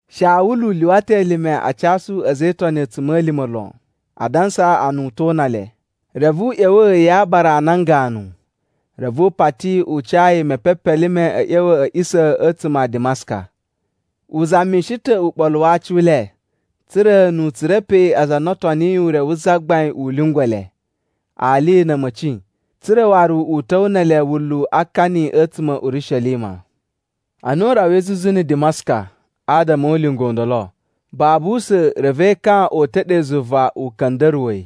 Shawulu lyuwa ta̱ elime a casu a̱za̱ e Itoni a̱tsuma̱lima̱ lon, adansa a na u to una le. Reve u ꞌya̱wa̱ ya aabara a nan ganu, reve u pati u ca yi mpepelime a̱ ꞌya̱wa̱ a̱ a̱ꞌisa̱ a̱tsuma̱ a Dimaska. U zamishi ta̱ uɓolu wa aci u le, tsa̱ra̱ nu u tsura̱ pe aza a na o toniyi Ure wu Zagbain u lyungwa̱ le, ali na̱ a̱ma̱ci, tsa̱ra̱ waru u ta̱wa̱ ne ele wunlu a akani a̱tsuma̱ a̱ Urishelima. Ana u rawai zuzu na̱ Dimaska adama o ulinga u ndolo, babu usa̱n reve ekan o uta̱ ɗe zuva u ka̱nda̱ruwa̱ yi.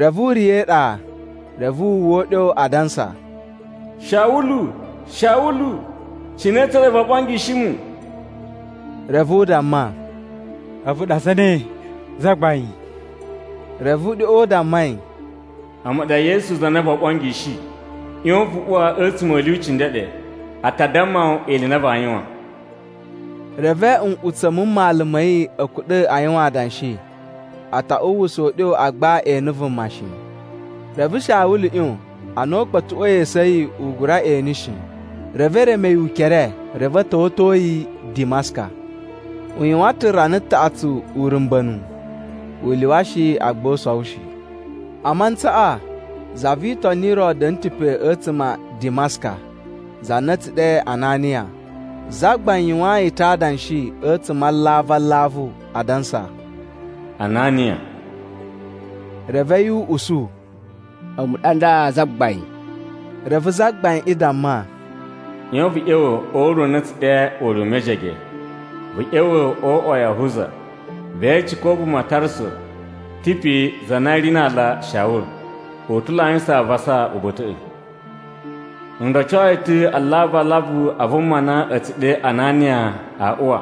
Reve u riya̱ e iɗa, reve wu uwwa uɗyo, adansa, “Shawulu, Shawulu, cine tsa ɗa voo ɓongishi mu?” Reve u damma, “A̱vu ɗa zane, Zagbain?” Reve uɗyoꞌo u damma yi, “A̱mu ɗa Yesu za na voo ɓongishi. ꞌYon vu uwa a̱tsuma̱ a̱ lyuci ndeɗe, a ta damma wu ili i na vaa yuwan.” Reve nꞌutsa̱ mu mmalu ma̱ yi a̱ kuɗa̱ a yuwan adanshi, a ta uwwusa uɗyo agba e ene vuma shi. Reve Shawulu ꞌyon, ana u kpa̱tuꞌwa̱i esu a̱ yi u gura ene shi. Reve e reme yi ukere reve a̱ ta̱wa̱to yi Dimaska. U yuwan ta̱ rana taꞌatsu urumba̱nu, u lyuwa shi agba u sowo shi. A mantsaꞌa za vi Itoni ro da̱na̱ ta̱ pe a̱tsuma̱ a Dimaska, za na a̱ tsu ɗe Ananiya. Zagbain yuwaan yi ta̱ adanshi a̱tsuma̱ a alavu alavu, adansa, “Ananiya.” Reve a̱yi u usu, “A̱mu ɗa nda Zagbain.” Reve Zagbaiꞌin damma, “ꞌYon vu ꞌya̱wa̱ o ure u na a̱ tsu ɗe Ure u Mejege. Vu ꞌya̱wa̱ o uꞌwa wa Yahuza ve ece ko vuma va Tarsu ta̱ pe za na ri na aala Shawulu. U ta̱ lo a yuwusan avasa uba̱ta̱ꞌa̱. N roco yi ta̱ alavu alavu a vuma na a̱ tsu ɗe Ananiya a uwa,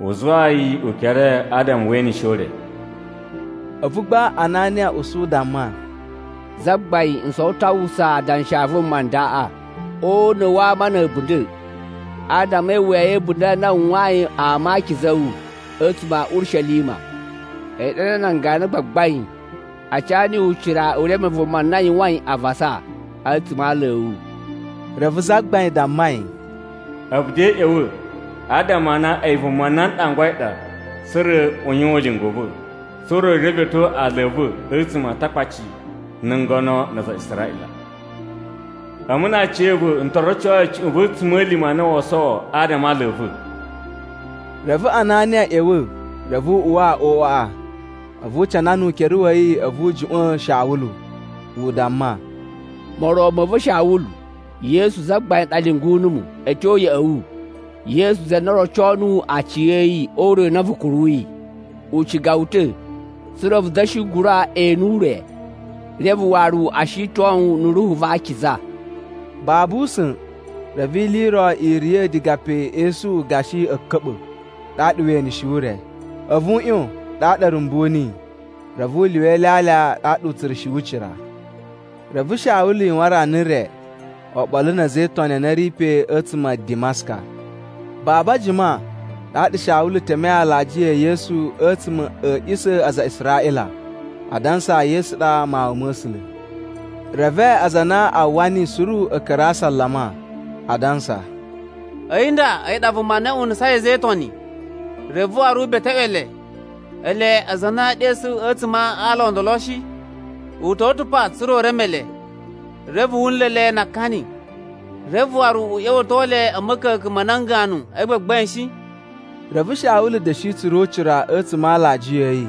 u zuwaa yi ukere adama we enishe ure.” A̱vu gba Ananiya usu u damma, “Zagbain n sowo ta̱ a uwwusa adanshi a vuma ndaꞌa o una̱ wa ama na̱ a̱bunda̱, adama e iwuya ya̱ a̱bunda̱ a na u yuwayin ama a akiza a̱ wu a̱tsuma̱ a̱ Urishelima. A̱yi ɗa nda nan ganu a gbagbain a ca niyi ucira u reme vuma na yuwain avasa a̱tsuma̱ a ala a̱ wu.” Reve Zagbain damma yi, “A̱vu de ꞌya̱wa̱ adama a na a̱yi vuma na n ɗangwai ɗa tsa̱ra̱ u yuwan ulinga u va̱, tsa̱ra̱ u revetyo ala a̱ va̱ a̱tsuma̱ a Atakpaci, na̱ ngono, na aza a Israꞌila. A̱mu na aciya̱va̱ n to roco yi cuꞌun va̱ a̱tsuma̱lima̱ a na woo sowo adama a ala a̱ va̱.” Reve Ananiya ꞌya̱wa̱ reve u uwa o uꞌwaꞌa, a̱vu u canana ukere wa̱ yi a̱vu u juꞌwa̱n Shawulu, u damma, “Moron ma̱ va̱ Shawulu, Yesu Zagbain ɗa lyungu numu a̱ tyo ya̱ꞌa̱ wu. Yesu za na roco nuwu aciya̱yi o ure u na vu kuruyi. U ciga wu ta̱ tsa̱ra̱ vu da̱shi gura ene ure, reve waru o shiton wu na̱ Ruhu va Akiza.” Babu usa̱n reve ili i ro i riya̱ diga pe esuꞌu gashi a̱ka̱ɓa̱, ɗaɗa we eneshi ure. A̱vu u ꞌyon, ɗaɗa a̱ rumbu niyi. Reve u lyuwa ilyalya ɗaɗa u tsura̱shi ucira. Reve Shawulu yuwan rana re oɓolo na̱ a̱za̱ e Itoni a na a̱ ri pe a̱tsuma̱ a Dimaska. Babu a jima, ɗaɗa Shawulu temei alajiya e Yesu a̱tsuma̱ a̱ a̱ꞌisa̱ a aza a Israꞌila, adansa Yesu ɗa Mawun ma̱ A̱sula̱. Reve aza a na a uwwa niyi suru a̱ ka̱ra̱ a asalama, adansa, “A̱yi nda a̱yi ɗa vuma na unusai a̱za̱ e Itoni, reve waru u beteꞌwe le, ele aza a na e ɗesu a̱tsuma̱ a ala o ndolo shi? U ta̱wa̱ ta̱ pa tsa̱ra̱ u reme le, reve wu nla̱ le na akani, reve waru u ꞌya̱wa̱to le a̱ ma̱ka̱ka̱n ma nan ganu a gbagbain shi?” Reve Shawulu da̱shi tsura̱ ucira a̱tsuma̱ a alajiya a̱ yi.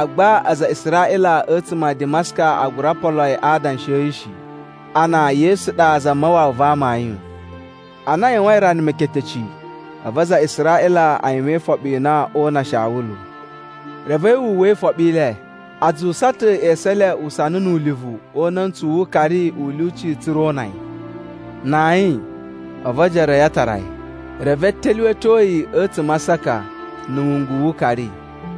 Agba aza a Israꞌila a̱tsuma̱ a Dimaska a gura polo yi a adanshi a̱ yi shi, a na Yesu ɗa Zamawawa va amayun. Ana a yuwain rana meketeci, a̱vu aza a Israꞌila a yuwan ifoɓi i na oo una Shawulu. Reve a̱yi wu uwwa ifoɓi i le. A zuwusa ta̱ esu e le usana nu ulivu o una̱ntsu wu ukari u lyuci tsa̱ra̱ o una yi. Na ayin, a̱vu ojoro a̱ yi a tara yi, reve a̱ ta̱lyuwa̱to yi a̱tsuma̱ a aasaka na̱ wungu wu ukari.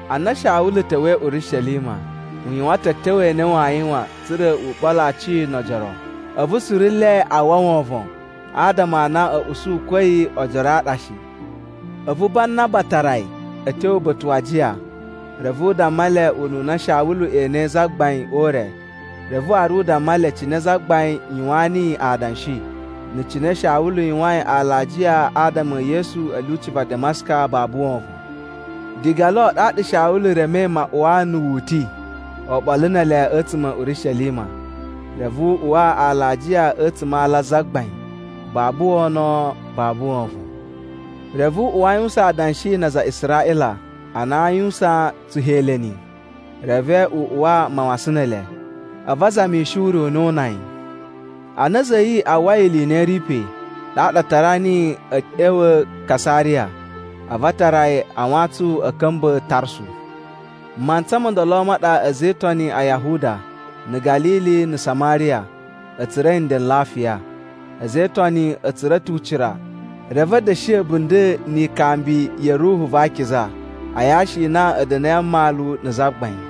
Ana Shawulu ta̱wa̱i Urishelima, u yuwan ta̱ a̱tyo a na waa yuwan tsa̱ra̱ u ɓolo aci no ojoro. A̱vu suru nle a uwwa wovon adama a na a̱ usu ko a̱yi oojoro a ɗa shi. A̱vu Banaba tara yi a̱ tyo uba̱ta̱ wa ajiya. Reve u damma le ununa Shawulu enei Zagbain o ure. Reve waru u damma le cine Zagbain yuwaan niyi adanshi, na̱ cine Shawulu yuwain alajiya adama e Yesu a̱ lyuci va Dimaska babu wovon. Diga lo ɗaɗa Shawulu remei maꞌuwa na̱ wu uti oɓolo ne ele a̱tsuma̱ a̱ Urishelima. Reve u uwa alajiya a̱tsuma̱ a ala a Zagbain, babu wono babu wovon. Reve u uwa a yuwusan adanshi na aza a Israꞌila a na a yuwusan Tsuheleni, reve u uwa mawasan ne ele. A̱vu a zamishi ure u na oo una yi. Ana a̱za̱ a̱ yi a uwwai ili i na i ri pe, ɗaɗa a tara niyi a̱ ꞌya̱wa̱ Kasariya a̱vu a tara yi a wantsun a̱ ka̱mba̱ Tarsu. Mantsa mo ndolo ma ɗa a̱za̱ e Itoni a Yahuda, na̱ Ga̱lili, na̱ Samariya, a̱ tsura̱i nden n lafiya. A̱za̱ e Itoni a̱ tsura̱ ta̱ ucira, reve a̱ da̱shi a̱bunda̱ ni ikambi ya̱ Ruhu va Akiza a yashi i na a̱ da̱na̱i a mmalu na̱ Zagbain.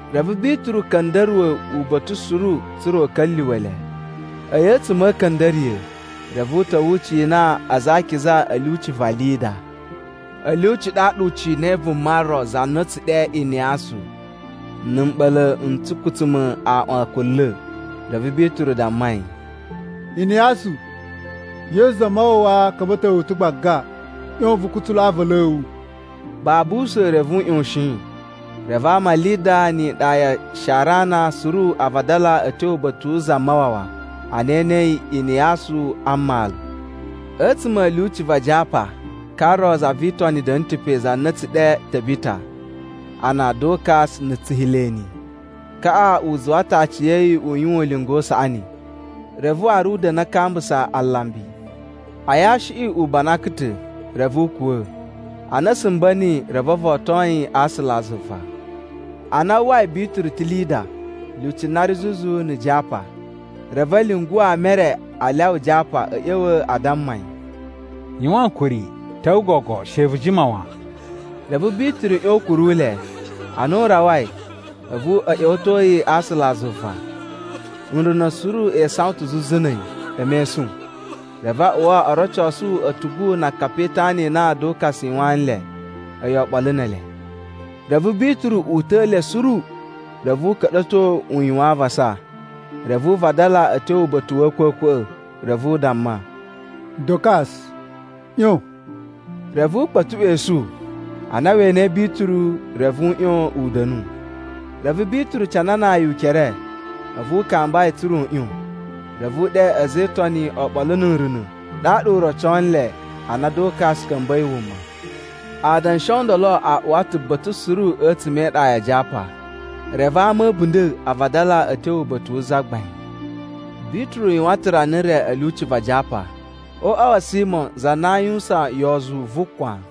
Reve Bituru ka̱nda̱ruwa̱ uba̱ta̱ suru tsa̱ra̱ u ka̱lyuwa̱ le. A̱yi a̱tsuma̱ a̱ a̱ka̱nda̱riya̱, reve u ta̱wa̱ u cina aza a akiza a̱ lyuci va Lida. A̱ lyuci ɗaɗa u cinai vuma ro za na a̱ tsu ɗe Iniyasu na̱ mɓa̱la̱ n tsukutsuma̱ aꞌwan kunla̱. Reve Bituru damma yi, “Iniyasu, Yesu Zamawawa ka̱mba̱to wu ta̱ gbaga. ꞌYon vu kutsulu aavalu a̱ wu.” Babu usa̱n, reve u ꞌyoshin. Reve ama a Lida ni iɗa ya Sharana suru a vadala a̱ tyo uba̱ta̱ wu Zamawawa ana e enei Iniyasu a mmalu. A̱tsuma̱ a̱ lyuci va Japa ka ro za vi Itoni da̱na̱ ta̱ pe za na a̱ tsu ɗe Tabita a na Dokas na̱ Tsuheleni. Kaꞌa u zuwa ta̱ aciya̱yi u yuwan ulinga u saꞌani, reve waru u da̱na̱ a kambusa alambi. A yashiꞌi u banakan ta̱, reve u kuwa̱. Ana a̱ sumba̱ niyi reve o voton yi a aasula a zuva. Ana a uwwai Bituru ta̱ Lida, lyuci na ri zuzu na̱ Japa, reve a̱ lyungu ama e re a lyawa Japa a̱ ꞌya̱wa̱ a damma yi, “Yuwan ankuri, ta̱wa̱ gogo, she vu jima wan.” Reve Bituru ꞌyon u kuru le. Ana u rawai, a̱vu a̱ ꞌya̱wa̱to yi a aasula a zuva. Nruna̱ suru e isawan ta̱ zuzu na̱ a̱yi, e mesun. Reve a uwa o rocosu a̱tugu na akapi e itana i na Dokas u yuwaan nle a̱yi oɓolo ne ele. Reve Bituru uta̱a̱ le suru, reve u ka̱ɗa̱to u yuwan avasa. Reve u vadala a̱ tyo uba̱ta̱ wa̱ a̱a̱kwa̱kwa̱ꞌa̱, reve u damma, “Dokas ꞌyon.” Reve u kpa̱tuꞌwa̱ esu. Ana we enei Bituru reve u ꞌyon u da̱nu. Reve Bituru cananaa yi ukere a̱vu u kamba yi tsa̱ra̱ u ꞌyon. Reve u ɗe a̱za̱ e Itoni oɓolo na̱ nruna̱, ɗaɗa u roco le a na Dokas ka̱mba̱i wuma. Adanshi o ndolo a uwa ta̱ ba̱ta̱ suru a̱tsuma̱ e iɗa ya Japa. Reve ama a̱ a̱bunda̱ a vadala a̱ tyo uba̱ta̱ wu Zagbain. Bituru yuwan ta̱ rana re a̱ lyuci va Japa, o uꞌwa wa̱ Simo za na aa yuwusan yozu vu kwan.